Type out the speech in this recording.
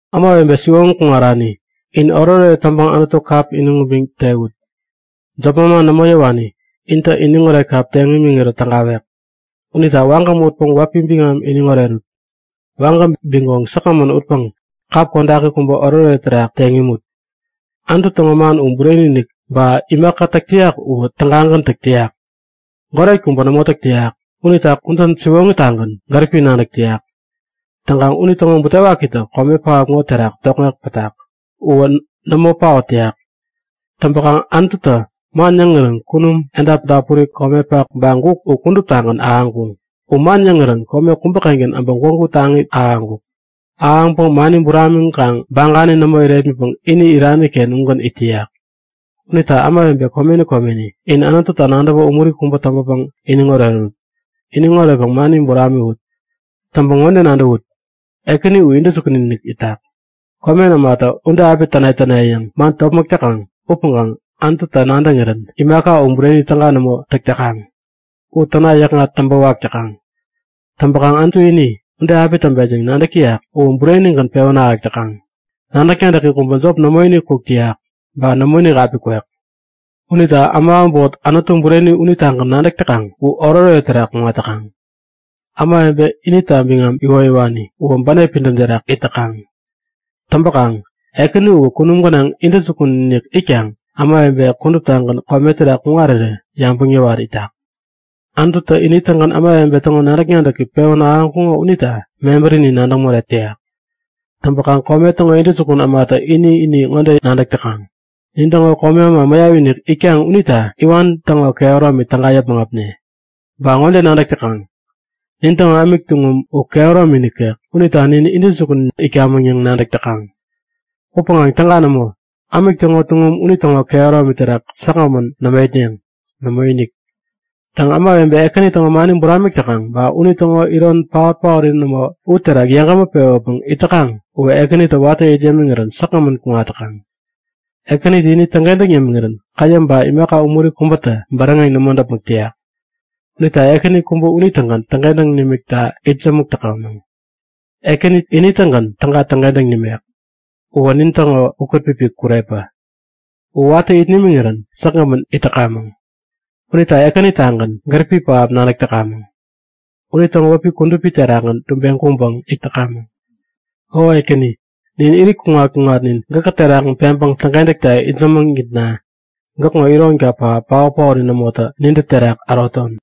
Ämawebe siwoŋi kuŋarani, in oretoret täŋpäŋ Anutu kap iniŋ ubiŋ tewut. Jop manman nämo yäwani intä iniŋoret kap teŋ imiŋirä tägawek. Unita wagäm utpäŋ wäpi biŋam iniŋ orerut! Wagäm bigoŋ säkgämän utpäŋ kap kodaki kubä oretoret terak teŋ imut! Anutu täŋo man u bureni-inik. Ba imaka täk täyak uwä tägagän täk täyak. Goret kubä nämo täk täyak. Unitä kudän siwoŋitagän gäripi nadäk täyak. Täŋkaŋ unitäŋo butewakitä kome pähap ŋo terak tokŋek täyak. Uwä nämo paot täyak. Täŋpäkaŋ Anututä man yäŋirän kunum, edap dapuri, komepak ba guk u kuduptagän ahäŋkuŋ. U man yäŋirän ume kubäkengän äbä gwägu taŋi ahäŋkuk. Ahäŋpäŋ mani buramiŋkaŋ bagani nämo irepmitpäŋ ini iraniken ugän it täyak. Unita ämawebe komeni komeni, in Anututa nadäwä umuri kubä täŋpäpäŋ iniŋ orerut! Iniŋ oretpäŋ mani buramiwut! Täŋpäŋ ŋode nadäwut; Ekäni u intäjukun itak. Komen ämatä ude api täne täne yäŋ man topmäk täkaŋ upäŋkaŋ Anututä nadäŋirän imaka u bureni täga nämo täk täkaŋ. U täna yäkŋat täŋpä wak täkaŋ. Täŋpäkaŋ Anutu ini, ude api täŋpet yäŋ nadäk täyak uwä burenigän pewän ahäk täkaŋ. Nadäk-nadäki kubä jop nämoinik kuk täyak, ba nämo api kwek. Unita äma äbot Anutu Bureni unitagän nadäk täkaŋ u oretoret terak kuŋat täkaŋ. Ämawebe inita biŋam iwoyäwani uwä bänep pidäm terak it täkaŋ. Täŋpäkaŋ Ekäni uwä kunum gänaŋ intäjukun-inik itkaŋ ämawebe kuduptagän kome terak kuŋarirä yabäŋ yäwat itak. Anututä ini-tägän ämawebe täŋo nadäk-nadäki pewän ahäŋkuŋo unita mebärinin nadäŋ morek täyak. Täŋpäkaŋ kome täŋo intäjukun ämatä ini-ini ŋode nadäk täkaŋ; Nin täŋo komi äma mäyap-inik itkaŋ unita iwan täŋo kehäromini täga yäpmäŋ äpne. Ba ŋode nadäk täkaŋ; Nin täŋo ämik tuŋum u kehäromi nikek unita nin intäjukun itkamäŋ yäŋ nadäk täkaŋ. Upäŋkaŋ täga nämo! Ämik täŋo tuŋum unitäŋo kehäromi terak säkgämän nämo itneŋ. Nämoinik! Täŋ ämawebe Ekäni täŋo mani buramik täkaŋ ba unitäŋo iron paot-paori nämo u terak yeŋgämä pewäpäŋ it täkaŋ uwä Ekänitä watä it yämiŋirän säkgämän kuŋat täkaŋ. Ekänitä ini täŋkentäŋ yämiŋirän käyäm ba imaka umuri kubätä bäräŋeŋ nämo däpmäk täyak. Unita Ekäni kubä unitägän täŋkentäŋ nimikta itsämäk täkamäŋ. Ekänitä ini-tägän täga täŋkentäŋ nimek. Uwä nintäŋo ukätpipik kurepä. U watä it nimiŋirän säkgämän it täkamäŋ. Unita Ekänitagän gäripi pähap nadäk täkamäŋ. Unitäŋo wäpi kudupi terakgän tubeŋ kuŋpäŋ it täkamäŋ. O Ekäni, nin irit kuŋat-kuŋatnin gäkä terakgän peŋpäŋ täŋkentäkta itsämäŋitna gäkŋo ironka pähap paot-paori nämotä nintä terak äroton!